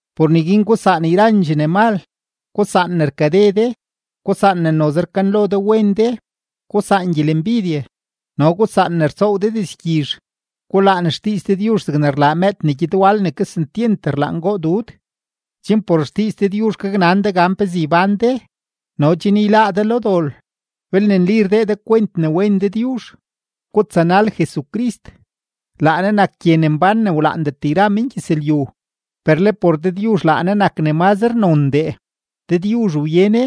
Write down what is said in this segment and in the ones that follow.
Por neguin gusaan yrandxee ne mal, gusaan ne rkade de, gusaan ne noze rkanlo de wen de, gusaan gyelembidye, no gusaan ne rtsoow de dizgyizh. Gulaan xdiiz Dëdyuzh zegne rlaa mëëd ne gyed wal ne kesentyent rlaan goo dud, chen por xdiiz Dëdyuzh gaknan de gan pezee ybán de no chen yláá de lo dol, belne nli rdee de kwent ne wen Dëdyuzh. Gutsanal Jesucrist; laa Ne nak gye ne mbán ne wlaandet yra mengyëzlyu, per le por Dëdyuzh laa Ne nak ne mazre nondee, Dëdyuzh wye Ne.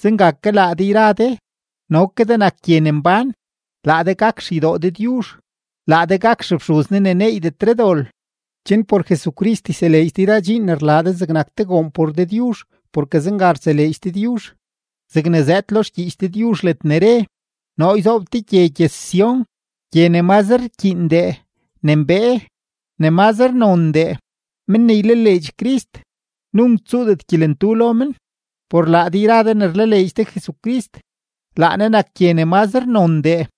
Zenga ke laa de yra de no ke de nak gye ne mbán, laa de gak xeydoo Dëdyuzh, laa de gak xefxuz Ne ne neeydetre dol, chen por Jesucrist yseleedx de yra dxiin ne rlaa de zegnak te goon por Dëdyuzh porke zenga rtseleedx Dëdyuzh. Zegne zëëd lo xgyiich Dëdyuzh ledne re: Noo yzoob te gye gyëz-Sión, gye ne mazre rkyiindee, ne mbee, ne mazre nondee. Men ne ylaleedx Crist, nunk tsuudet gyelentu lo men. Por laa de yra de ne rlaleedx de Jesucrist, laa Ne nak gye ne mazre nondee.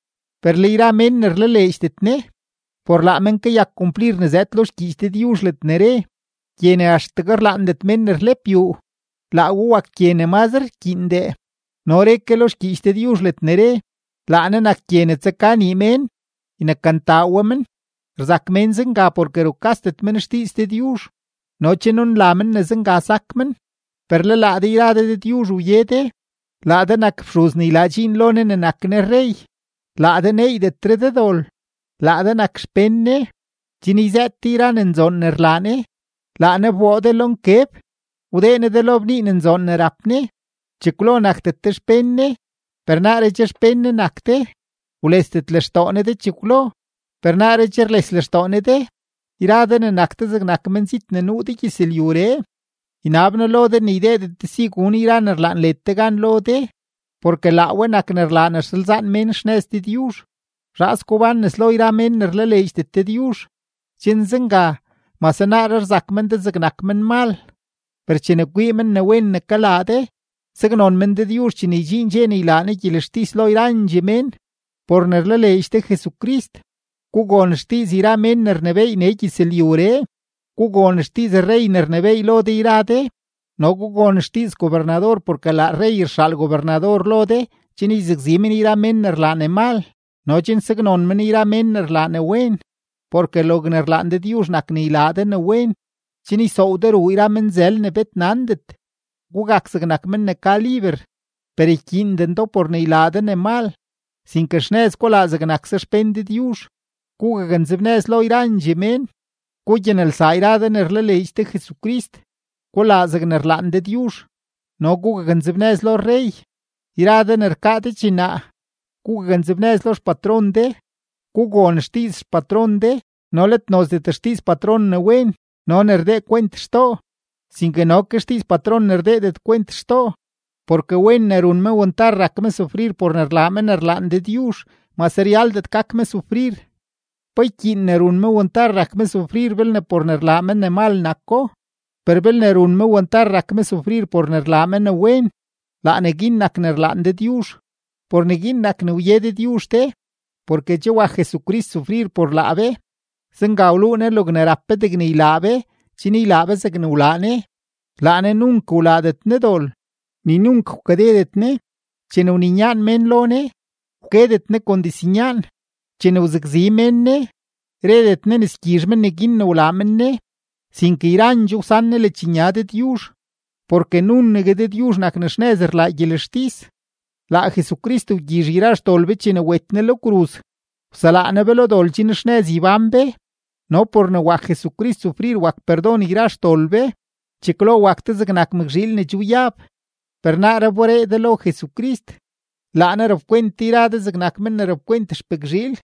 Per le yra mén ne rlaleedxdet Ne, por laa men kayak kumplir ne zëëd lo xgyiich Dëdyuzh ledne re: Gye ne axtegue rlaandet mén ne rlep yuu, laa we wak gye ne mazre rkyiindee. No re ke lo xgyiich Dëdyuzh ledne re: Laa Ne nak gye ne tsaka nii mén, ynekantaa we men. Rzak mén zenga porke rukasdet men xdiiz Dëdyuzh no che nunla men ne zenga sak men. Per laa de yra de Dëdyuzh wye de, laa de nak fxuz ne ylaa dxiin lo Ne ne nak Ne rrey, laa de neeydetre de dol, laa de nak xpén Ne, chen yzëët de yra ne nzoon ne rlaa Ne. Laa Ne wboo de lo nkeb, wdee Ne de lo bnii ne nzoon ne rap Ne. Chekwlodee nakdet de xpén Ne, per naaree che xpén Ne nak de; wlesdet lextoo Ne de chekwlo, per naaree che rles lextoo Ne de. Yra de ne nak de zegnak menzit ne nuu de gyëzlyuree, ynab noo lo de ne ydeedet de si gun yra ne rlaan led de gan lo de, porke laa we nak ne rlaa ne rsalzaan mén xnëz Dëdyuzh. Zhaas gubán nes lo yra mén ne rlaleedxdet Dëdyuzh, chen zenga mase naaree rzak men de zegnak menmal, per chene kwii men ne wen ne kalaa de, saknon men Dëdyuzh chene ydxiin dxe ne ylaa Ne gyelextis lo yrandxee mén. Por ne rlaleedx de Jesucrist, gugon xdiiz yra mén ne rnebééy nee gyëzlyuree; gugon xdiiz rrey ne rnebééy lo de yra de, no gugon xdiiz gobernador porke laa rrey rxaal gobernador lo de chen yzakzi men yra mén ne rlaa ne mal no chen saknon men yra mén ne rlaa ne wen. Porke logne rlaan Dëdyuzh nak ne ylaa de ne wen, chen ysoow de ruu yra menzël ne bet nandet. Gugak zegnak men ne ka liber, per ykyiinden do por ne ylaa de ne mal, sinke xnëz gulaa zegnakse xpén Dëdyuzh. Gugaknzebnëz lo yrandxee mén, gugyanelsaa yra de ne rlaleedx de Jesucrist, gulaa zegne rlaan Dëdyuzh, no gugaknzebnëz lo rrey. Yra de ne rkaa de dxinaa, gugaknzebnëz lo xpatron de, gugon xdiiz xpatron de no let nozdet xdiiz patron ne wen no ne rdee kwent xtoo, sinke no ke xdiiz patron ne rdeedet kwent xtoo. Porke wen ne run me wantar rak me sufrir por ne rlaa me ne rlaan Dëdyuzh mase ryaldet gak me sufrir. ¿Pa ykyiin ne run me wantar rak me sufrir belne por ne rlaa me ne mal nako? Per belne run me wantar rak me sufrir por ne rlaa me ne wen, laa neguin nak ne rlaan Dëdyuzh. Por neguin nak ne wye Dëdyuzh de, porke che wak Jesucrist sufrir por laa be. Zenga wluu Ne logne rap be degne ylaa be chen ylaa be zegne wlaa Ne. Laa Ne nunk wlaadet Ne dol, ni nunk wkadedet Ne. Chene wninyaan mén lo Ne, wkedet Ne kon diznyaan; chene wzakzi mén Ne, redet Ne ne sgyizh men neguin ne wlaa men Ne, sinke yrandxoo wsan Ne ledxnya Dëdyuzh, porke nunegue Dëdyuzh nak ne xnëz rlaa gyelextis. Laa Jesucrist wgyizh yra xdol be chene wet Ne lo kruz, wselaa Ne be lo dol chen xnëz ybán be; no por ne wak Jesucrist sufrir wak perdon yra xdol be. Chekwlo wak de zegnak mëkzhiil ne che wyab, per naaree wberee de lo Jesucrist. Laa Ne rapkwent de yra de zegnak men ne rapkwent xpëkzhiil.